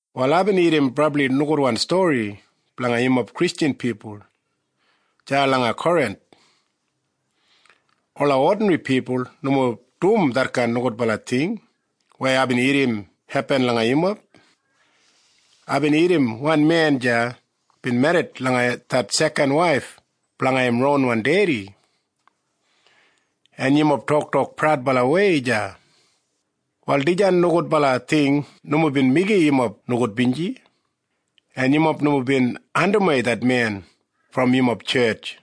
Wal aibin irrim brabli nogudwan stori blanga yumob Kristjan pipul deya langa Korinth. Ola odinri pipul nomo dum detkain nogudbala ting weya aibin irrim hepin langa yumob. Aibin irrim wan men deya bin merrit langa det sekan waif blanga im ronwan dedi. En yumob toktok praudbalawei deya! Wal dijan nogudbala ting nomo bin meigim yumob nogudbinji, en yumob nomo bin andimwei det men brom yumob tjetj.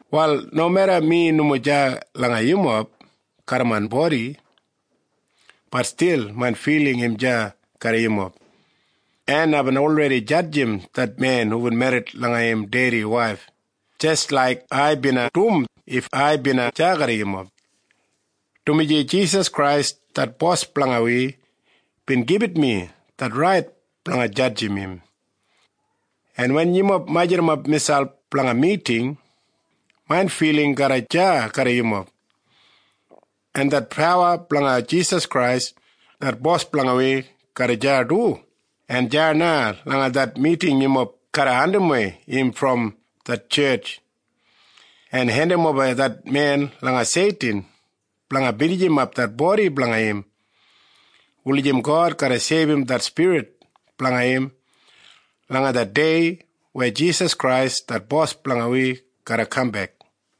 Wal nomeda mi nomo deya langa yumob garram main bodi, bat stil main filing im deya garram yumob, en aibin olredi jadjim det men hubin merrit langa im dedi waif jis laik ai bina dum if ai bina deya garram yumob, dumaji Jisas Krais det Bos blanga wi bin gibit mi det rait blanga jadjim im. En wen yumob majurrumap miselp blanga miting, main filing garra deya garram yumob, en det pawa blanga Jisas Krais det Bos blanga wi garra deya du, en deya na langa det miting yumob garra andimwei im brom det tjetj en hendimoba det men langa Seitin blanga binijimap det bodi blanga im wulijim God garra seibum det spirit blanga im langa det dei weya Jisas Krais det Bos blanga wi garra kambek.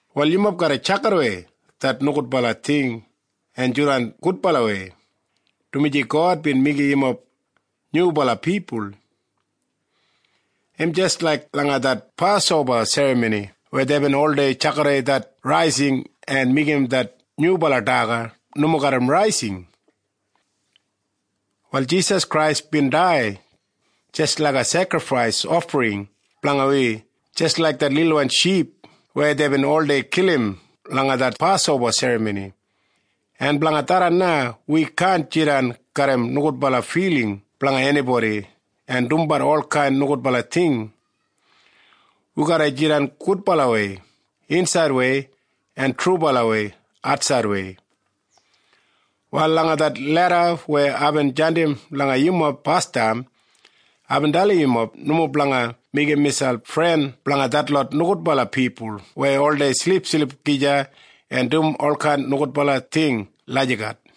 Wal yumob garra tjakidawei det nogudbala ting en jidan gudbalawei, dumaji God bin meigim yumob nyubala pipul. Im jis laik langa det Pasoba Serramoni weya deibin oldei tjakidawei det raising en meigim det nyubala daga nomo garram raising. Wal Jisas Krais bin dai jis laiga sekrifais ofring blanga wi jis laik det lilwan ship weya deibin oldei kilim langa det Pasoba Serramoni, en blanga tharran na wi kaan jidan garram nogudbala filing blanga enibodi en dumbat olkain nogudbala ting. Wi garra jidan gudbalawei insaidwei en trubalawei atsaidwei. Wal langa det leda weya aibin jandim langa yumob basdam, aibin dalim yumob nomo blanga meigim miselp fren blanga detlot nogudbala pipul weya oldei silipsilip gija en dum olkain nogudbala ting lagijat.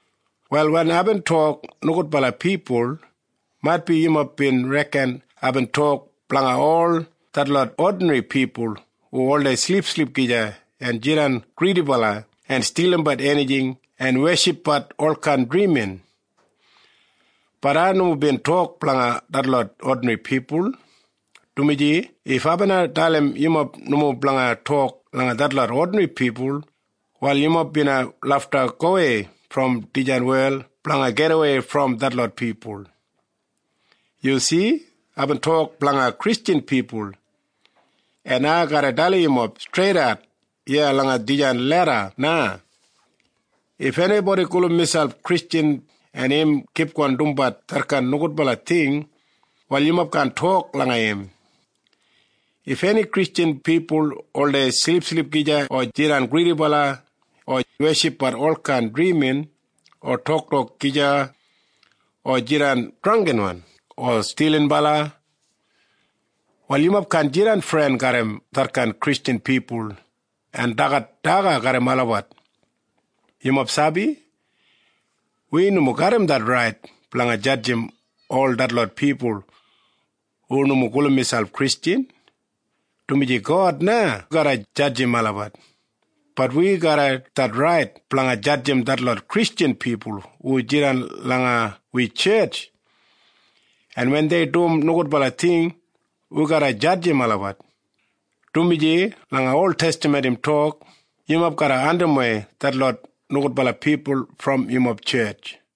Wal wen aibin tok “nogudbala pipul”, maitbi yumob bin reken aibin tok blanga ol detlot odinri pipul hu oldei silipsilip gija en jidan gridibala en stilimbat enijing en weshipbat olkain drimin. Bat ai nomo bin tok blanga detlot odinri pipul, dumaji if ai bina dalim yumob nomo blanga tok langa detlot odinri pipul, wal yumob bina lafta gowei brom dijan wel blanga gidawei brom detlot pipul. Yu si? Aibin tok blanga Kristjan pipul. En ai garra dalim yumob streidat iya langa dijan leda na. If enibodi gulum miselp Kristjan, en im kipgon dumbat detkain nogudbala ting, wal yumob kaan tok langa im. If eni Kristjan pipul oldei silipsilip gija o jidan gridibala o weshipbat olkain drimin o tokabat gija o jidan drangginbala o stilinbala, wal yumob kaan jidan fren garram detkain Kristjan pipul en dagat daga garram olabat. Yumob sabi? Wi nomo garram det rait blanga jadjim ol detlot pipul hu nomo gulum miselp Kristjan, dumaji God na garra jadjim olabat. Bat wi garram det rait blanga jadjim detlot Kristjan pipul hu jidan langa wi tjetj, en wen dei dum nogudbala ting, wi garra jadjim olabat, dumaji langa oltestaman im tok, “Yumob garra andimwei detlot nogudbala pipul brom yumob tjetj.”